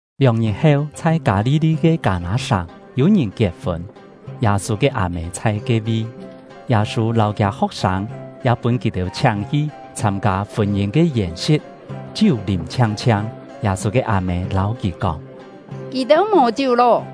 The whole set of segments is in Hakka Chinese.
Lióng-ngit heu, chhai Kâ-li-li ke Kâ-nâ-sàng, yû-ngìn kiet-fûn. Yâ-sû ke â-mê chhai ke-vi; Yâ-sû lâu kiâ ho̍k-sâng ya pûn kì-têu chhiáng-hi chhâm-kâ fûn-yîn ke yèn-si̍t. Chiú lîm chhiang-chhiang, Yâ-sû ke â-mê lâu kì kóng: “Kì-têu mò chiú lô.”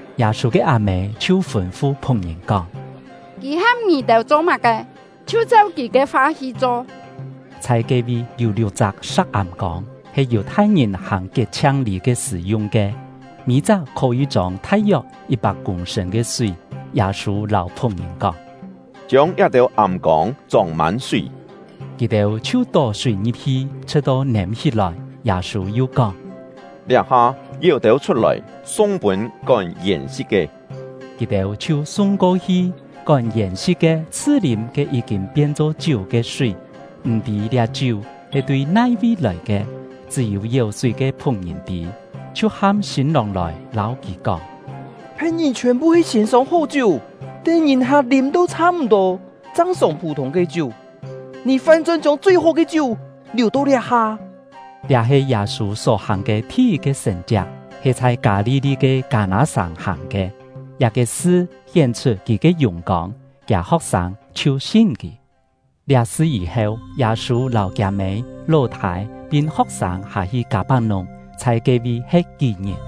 Yâ-sû ke â-mê chhiu fûn-fu phu̍k-ngìn kóng: “Kì ham ngì-têu cho má-ke, chhiu cheu kì ke fa hi cho.” Chhai ke-vi yû liuk-chak sa̍k âm-kông, he Yù-thai-ngìn hàng kiet-chhiang-lî ke sṳ̀ yung ke, mî-chak khó-yî chông thai-yok yit-pak kûng-sṳ̂n ke súi. Yâ-sû lâu phu̍k-ngìn kóng: “Chiông liá-têu âm-kông chông-mân súi.” Kì-têu chhiu tó súi ngi̍p-hi, chhṳ̍t-to nêm-hí-lòi. Yâ-sû yu kóng: “Liá-ha, yéu têu chhut-lòi, sung pûn kón yèn-si̍t ke.” Kì-têu chhiu sung ko-hi. Kón yèn-si̍t ke chhṳ-lîm ke yí-kîn pien-cho chiú ke súi, m̀-tî liá chiú he tui nai-vi lòi ke (chṳ́-yû yéu-súi ke phu̍k-ngìn tî), chhiu ham sîn-lòng lòi, lâu kì kóng: “Phe̍t-ngìn chhiòn-phu he siên sông hó chiú, tén ngìn-hak lîm-to chhâ-m̀-tô chang sông phû-thûng ke chiú; ngì fán-chón chiông chui-hó ke chiú liù-to liá-ha!” Liá he Yâ-sû só-hàng ke thi-yit-ke sṳ̀n-chiak, he chhai Kâ-li-li ke Kâ-nâ-sàng hàng ke. Liá-ke sṳ hién-chhut kì ke yùng-kông; kiâ ho̍k-sâng chhiu sin kì. Liá sṳ yî-heu, Yâ-sû lâu kiâ-mê, ló-thâi, pin ho̍k-sâng hâ-hi Kâ-pak-nùng, chhai ke-vi he̍t kí-ngit.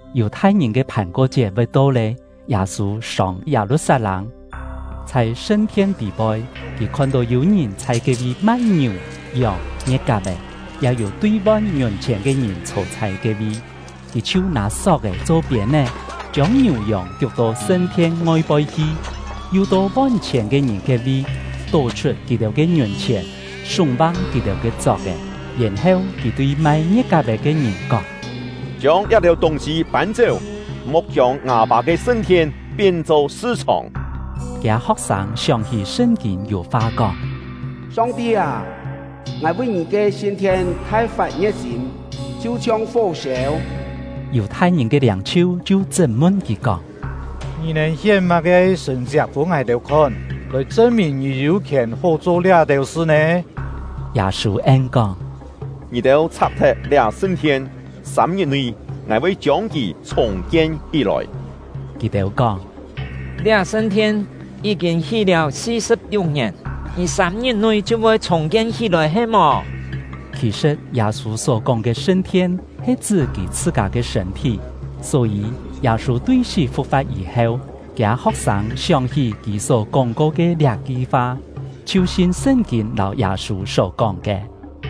Yù-thai-ngìn ke Phàn-ko-chiet voi to lé, Yâ-sû sông Yâ-lu-sat-lâng hi. Chhai sṳn-thien tî-poi, kì khon-tó yû ngìn chhai ke-vi mai ngiù, yòng, ngie̍t-kap-è, ya yû tui-von ngiùn-chhièn ke ngìn chhô chhai ke-vi. Kì chhiu nâ sok-è cho piên-é, chiông ngiù yòng kiuk-to sṳn-thien ngoi-poi hi, yu to von-chhièn ke ngìn ke-vi, tó-chhut kì-têu ke ngiùn-chhièn, súng-vang kì-têu ke chok-è. Yèn-heu kì tui mai ngie̍t-kap-è ke ngìn kóng: “Chiông liá-têu tûng-sî pân-chéu, mo̍k chiông ngâ Pâ ke sṳn-thien pien-cho sṳ-chhòng!” Kiâ ho̍k-sâng sióng-hí Sṳn-kîn yû fa kóng: “Song-ti â, ngài vi Ngì ke sṳn-thien thai-fat ngie̍t-sîm, chhiu-chhiong fó-sêu!” Yù-thai-ngìn ke liâng-chhiu chhiu chṳt-mun kì kóng: “Ngì nèn hién má-ke sṳ̀n-chiak pûn ngài-têu khon, lòi chṳn-mìn ngì yû khièn hó cho liá-têu sṳ nè?” Yâ-sû en-kóng: “Ngì-têu chhak-thet liá sṳn-thien, sâm-ngit-nui, ngài voi chiông kì chhùng-kien hí-lòi.” Kì-têu kóng: “Liá sṳn-thien yí-kîn hí lé si-sṳ̍p-liuk ngièn, ngì sâm-ngit-nui chhiu voi chhùng-kien hí-lòi he-mò?” Khì-sṳ̍t, Yâ-sû só-kóng ke sṳn-thien he chṳ́ kì chhṳ-kâ ke sṳ̂n-thí. Só-yî, Yâ-sû tui sí fu̍k-fa̍t yî-heu, kiâ ho̍k-sâng sióng-hí kì só kóng-ko ke liá-ki fa, chhiu sin Sṳn-kîn lâu Yâ-sû só-kóng ke.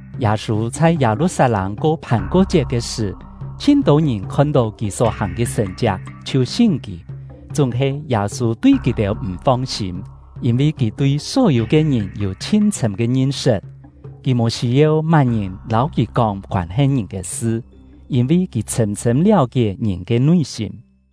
Yâ-sû chhai Yâ-lu-sat-lâng ko Phàn-ko-chiet ke sṳ̀, chhin-tô ngìn khon-tó kì só-hàng ke sṳ̀n-chiak, chhiu sin kì. Chúng-he Yâ-sû tui kì-têu m̀ fong-sîm, yîn-vi kì tui só-yû ke ngìn yû chhin chhṳ̂m ke ngin-sṳt. Kì mò sî-yeu má-ngìn lâu kì kóng koân-he ngìn ke sṳ, yîn-vi kì chhṳ̂m-chhṳ̂m liáu-kié ngìn ke nui-sîm.